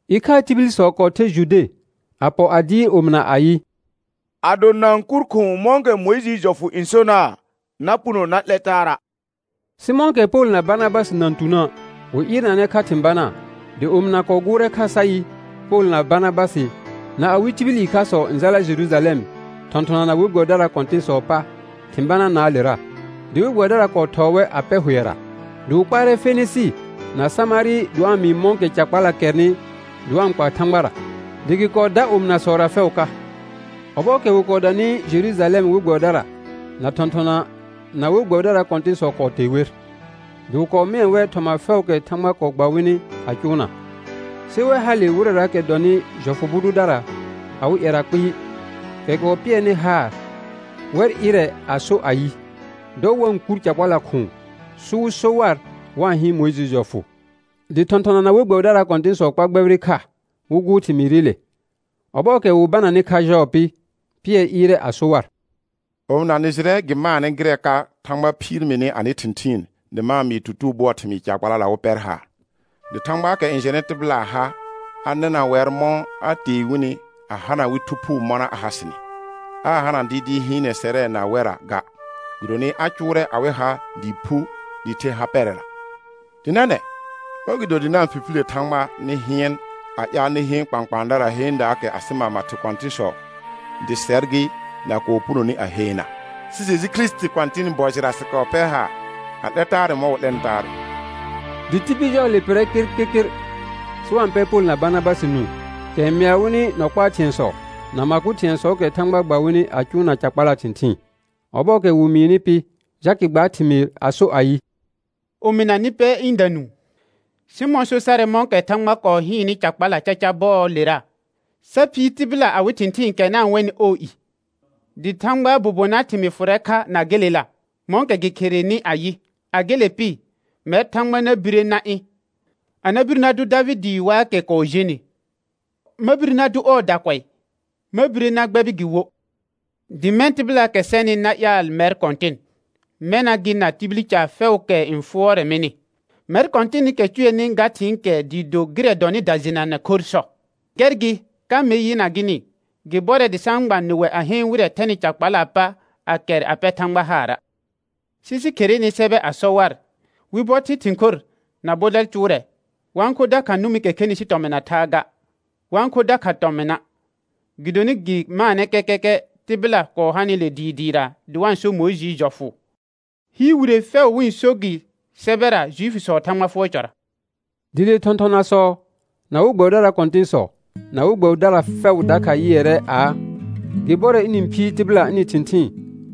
Ɩkhaa tibilsɔ kɔɔ ther Jude a pɔ a dɩɩr omɩna ayɩ: Ado na-n kur khʋ̃ʋ mɔ̃kɛ Mʋɩjɩɩ jɔfʋ n sona', na puno na 'lɛ taara'. Sɩ mɔ̃kɛ Pol na Barnabasɩ na-n tunə', wɩ ɩɩrnanɛ kha thɩ̃ banaa; dɩ omɩna kɔɔ gʋʋrɛ kha sa yɩ, Pol na Barnabasɩ na awɩ tibil ɩkhasɔ n jala Jerujalɛm thɔ̃thɔnana na we gbɛbɩdaraa kɔ̃tɩ̃sɔɔ pa thɩ̃ banaanaalera. Dɩ we gbɛbɩdara kɔɔ thɔɔ wɛr a pɛ hʋɛra, dɩ wɩ kpaarɛ Fenɩsɩ na Samarɩ dɩ wa-n mɩɩ mɔ̃kɛ ca kpala kɛrnɩ dɩ wa-n kpa Thãgbara, dɩ gɩ kɔɔ dar omɩnasɔra fɛʋ ka. Ɔbɔɔkɛ wɩ kɔɔ danɩ Jerujalɛm we gbɛbɩdara, na thɔ̃thɔna, na we gbɛbɩdaraa kɔ̃tɩ̃sɔ kɔɔ tee wer, dɩ wɩ kɔɔ mɩɛ wɛr thɩ̃ɛ fɛʋʋkɛ Thãgba kɔɔ gba wɩnɩ a cʋʋna. Sɩ wɛ hale wɩrɛraakɛ dɔnɩ jɔfʋ bʋ dʋdara awɩ ƴɛra kpɩɩ, kɛ kɔɔ pɩɛrnɩ haar, wɛr ɩrɛ a so ayɩ, dɔ wa-n kur ca kpala khʋ̃ʋ, sɩ wɩ so war wa-n hɩɩn Mʋɩjɩɩ jɔfʋ. Dɩ thɔ̃thɔna na we gbɛbɩdaraa kɔ̃tɩ̃sɔ kpar gbɛbɩrɩ kha wɩ gʋʋr thɩmɩɩrɩle. Ɔbɔɔkɛ wɩ bananɩ kha jɔɔ pɩ, Pɩɛr ɩɩrɛ a so war: Omɩna, nɩ jɩrɛ gɩ maanɛ gɩrɛ ka Thãgba phiir mini anɩ thɩ̃thɩɩn dɩ ma-n mɩɩ tutugo bʋɔɔ thɩmɩɩ ca kpalala wɩ pɛr haar; dɩ Thãgbaakɛ n jɛnɩ tɩbɩlaa ha, a nɩna wɛr mɔ̃ a tee wɩnɩ a hana wɩ Thu Phuu mɔna a ha sɩnɩ; aa hana dɩɩdɩɩ hɩɩnɛ sɛrɛ na wɛrra ga, gɩdonɩ a cʋʋrɛ awɩ ha dɩɩ phu dɩɩ the ha pɛrɛra. Dɩ nɛnɛ̃ mɔ̃gɩdo dɩ na-n fifilə Thãgba nɩ hɩɩn a ƴaal nɩ heen kpãkpãadara heendaakɛ asɩ mama thɩ kɔ̃tɩ̃sɔ, dɩ sɛr gɩ, na kɔɔ punoni a heena? Sɩ Jeju Kirisiti Kɔ̃tɩnɩ bɔ jɩra sɩ pɛr haar a 'lɛ taarɛ mɔ̃ wɩ 'lɛnɩ taarɛ. Dɩ tibil jɔɔle pɩrrɛ kɩrkɩrkɩr sɩ wa-n pɛ Pol na Barnabasɩ nũu, kɛ n mɩa wɩnɩ nɔ kpaa thɩ̃ɛsɔ na ma kʋ thɩ̃ɛsɔɔkɛ Thãgba gba wɩnɩ a cʋʋna ca kpalaa thɩ̃thɩɩn. Ɔbɔɔkɛ wɩ mɩɩnɩ pɩ, Jakɩ gbaar thɩmɩɩr a so ayɩ: Omɩna, nɩ pɛ ɩ̃da nũu. Sɩmɔ̃ so sarɛ mɔ̃kɛ Thãgba kɔɔ hɩɩnnɩ ca kpala caca bɔɔlera, sa phiir tɩbɩla awɩ thɩ̃thɩɩn kɛ na-n wɛnɩ ɔɔ i. Dɩ Thãgbaa bobonaa thɩmɩɩ fʋrɛ kha na gelela, mɔ̃kɛ gɩ kherenɩ ayɩ: «A gele pɩ, mɛr Thãgba na bire na ɩ̃; a na bir na dʋ Davɩdɩɩ waakɛ kɔɔ jenɩ. Ma bire na dʋ ɔɔ dakʋɛ, ma bire na gbɛbɩ gɩ wo. Dɩ mɛ̃ tɩbɩlaakɛ sɛnɩ na ƴaal mɛr Kɔ̃tɩn; mɛna gɩ na tibil caar fɛʋʋkɛ n fʋɔrɛ mɩnɩ. Mɛr Kɔ̃tɩnɩkɛ cʋɛnɩ ga thɩ̃ɩkɛ dɩɩ do gɩrɛ dɔnɩ dajɩnanɛ khorr sɔ.» Gɛr gɩ, ka mer yɩna gɩnɩ, gɩ bɔrɛ dɩ sa-n gba nɩwɛ a heen wɩrɛ thɛnɩ ca kpalaa pa a kɛr a pɛ Thãgba haara'. Sɩ sɩ kherene sɛbɛ a sɔ war, wɩ bɔ thɩl thĩ khor, na bɔdɛl cʋʋrɛ, wa-n kho dakha nʋmɩkɛ khenɩ sɩ tɔmɩn na thaa ga, wa-n kho dakha tɔmɩna'. Gɩdonɩ gɩ maanɛ kɛkɛkɛ tɩbɩla kɔɔ hanɩle dɩɩ dɩɩra dɩ wa-n so Mʋɩjɩɩ jɔfʋ. Hɩɩr wire fɛʋ wɩ-n gɩ sɛbɛra Juifiisɔɔ Thãgba fʋɔr cɔra. Dɩ le thɔ̃thɔnasɔ, na we gbɛbɩdaraa kɔ̃tɩ̃sɔ, na we gbɛbɩdara fɛʋ dakha yɩɛrɛ aa, gɩ bɔrɛ ɩnɩ-n phiir tɩbɩla ɩnɩ thɩ̃thɩɩn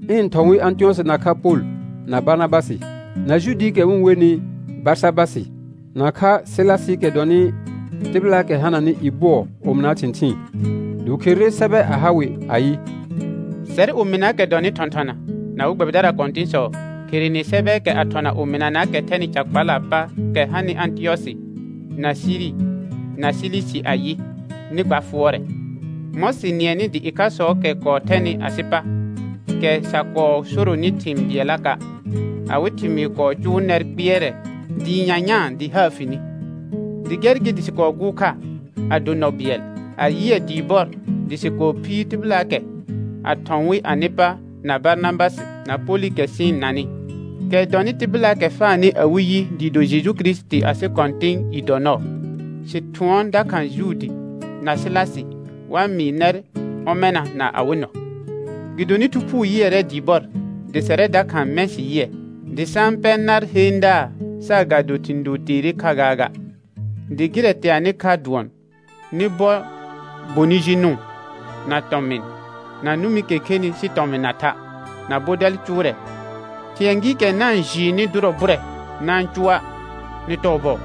ɩnɩ-n thɔ̃ wɩ Ãtɩyɔsɩ nakha Pol, na Barnabasɩ, na Juudiikɛ wɩ-n wenɩ Barsabasɩ, nakha Sɩlasɩɩkɛ dɔnɩ tɩbɩlaakɛ hananɩ i bʋɔ omɩnaa thɩ̃thɩɩn. Dɩ wɩ kherere sɛbɛ a ha wɩ ayɩ: Sɛr omɩnaakɛ dɔnɩ thɔ̃thɔna, na we gbɛbɩdaraa kɔ̃tɩ̃sɔ, kherene sɛbɛɛkɛ a thɔna omɩnanaakɛ thɛnɩ ca kpalaa pa kɛ hanɩ Ãtɩyɔsɩ, na Siri, na Silisi ayɩ: Nɩ gba fʋɔrɛ. Mɔ̃ sɩ nɩɛnɩ dɩ ɩkhasɔɔkɛ kɔɔ thɛnɩ asɩ pa, kɛ sa kɔɔ soronɩ thɩ̃ bɩɛllaka', awɩ thɩmɩɩ kɔɔ cʋʋ nɛr kpɩɛrɛ dɩɩ nyanyãa dɩ haar fi ni; dɩ gɛr gɩ sɩ kɔɔ gʋʋr kha, a do nɔ bɩɛl, a yɩɛ dɩɩ bɔr dɩ sɩ kɔɔ phiir tɩbɩlaakɛ, a thɔ̃ wɩ anɩ pa na Barnabasɩ na Polɩkɛ sɩ-n nanɩ, kɛ dɔnɩ tɩbɩlaakɛ faanɩ awɩ yi dɩɩ do Jeju Kirisiti asɩ Kɔ̃tɩnɩ i dɔ nɔɔ. Sɩ thʋɔn dakha Juudi na Sɩlasɩ, wa mɩɩ nɛr ɔmɛna na awɩ nɔ. Gɩdonɩ Thu Phuu yɩɛrɛ dɩɩ bɔr, dɩ sɛrɛ dakha mɛ̃ sɩ yɩɛ, dɩ sa-n pɛ nar heendaa saagado thɩ̃ doo teere kha gaaga, dɩ gɩrɛ teanɩ kha dʋɔn: Nɩ bɔ bonɩ ji nʋʋn, na tɔmɩn, na nʋmɩkɛ khenɩ sɩ tɔmɩn na tha', na bɔdɛl cʋʋrɛ, thɩ̃ɛ gɩɩkɛ na n jɩɩnɩ dʋrɔ bʋrɛ, na-n cʋa'. Nɩ tɔɔ bɔɔ.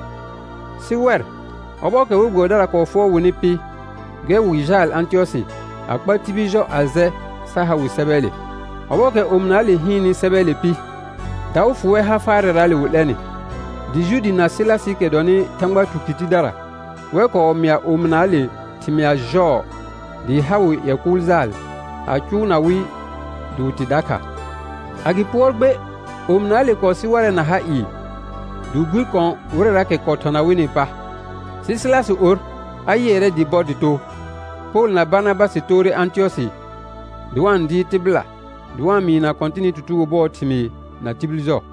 Sɩ wɛr, ɔbɔɔkɛ we gbɛbɩdara kɔɔ fʋɔr wɩnɩ pɩ, gɛr wɩ jaal Ãtɩyɔsɩ a kpa tibil jɔ a jɛ sa ha wɩ sɛbɛɛle. Ɔbɔɔkɛ omɩnaale hɩɩnnɩ sɛbɛɛle pɩ, daʋ fʋ wɛr ha faarɛraale wɩ 'lɛnɩ. Dɩ Juudi na Sɩlasɩɩkɛ dɔnɩ Thãgba tukɩr tidara, wɛr kɔɔ mɩa omɩnaale thɩmɩa jɔɔ dɩɩ ha wɩ ƴɛ kʋʋl jaal a cʋʋna wɩ dɩ wɩ tɩ dakha. A gɩ pʋɔr gbe, omɩnaale kɔɔ sɩ warɛ na ha ɩɩ dɩ wɩ bir kɔ̃ wɩrɛraakɛ kɔɔ thɔna wɩnɩɩ pa. [Sɩ Sɩlasɩ or, a yɩɛrɛ dɩɩ bɔr dɩ too.] Pol na Barnabasɩ toore Ãtɩyɔsɩ dɩ wa-n dɩɩr tɩbɩla, dɩ wa-n mɩɩna Kɔ̃tɩnɩ tutugo bʋɔɔ thɩmɩɩ na tibil jɔ.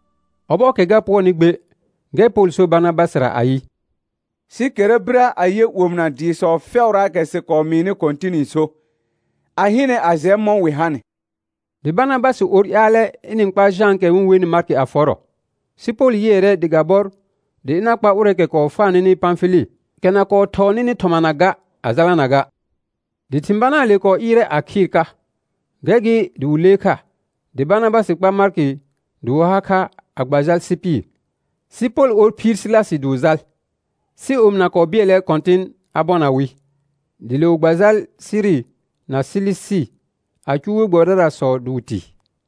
Ɔbɔɔkɛ ga pʋɔrnɩ gbe, gɛr Pol sor Barnabasɩra ayɩ: Sɩ kɛra birə a yɛ omɩna dɩɩsɔ fɛʋraakɛ sɩ kɔɔ mɩɩnɩ Kɔ̃tɩnɩ so, a hɩnɛ a jɛ mɔ̃ wɩ hanɩ. Dɩ Barnabasɩ or ƴaalɛ ɩnɩ-n kpa Jãakɛ wɩ-n wenɩ Markɩ a fɔrɔ, sɩ Pol yɩɛrɛ dɩ ga bɔr dɩ ɩna kpa ʋrɛɛkɛ kɔɔ faa nɩnɩ Pãfɩlɩ, kɛ na kɔɔ thɔɔ nɩnɩ thɔmana ga, a jalana ga. Dɩ thɩ̃ banaale kɔɔ ɩɩrɛ a khɩɩr ka, gɛr gɩ dɩ wɩ lee kha, dɩ Barnabasɩ kpa Markɩ dɩ wɩ ha kha a gba jal Sɩpɩr. Sɩ Pol or phiir Sɩlasɩ dɩ wɩ jal, sɩ omɩna kɔɔ bɩɛlɛ Kɔ̃tɩn a bɔna wɩ. Dɩ le wɩ gba jal Siri na Silisi a cʋʋ we gbɛbɩdarasɔ dɩ wɩ tɩ.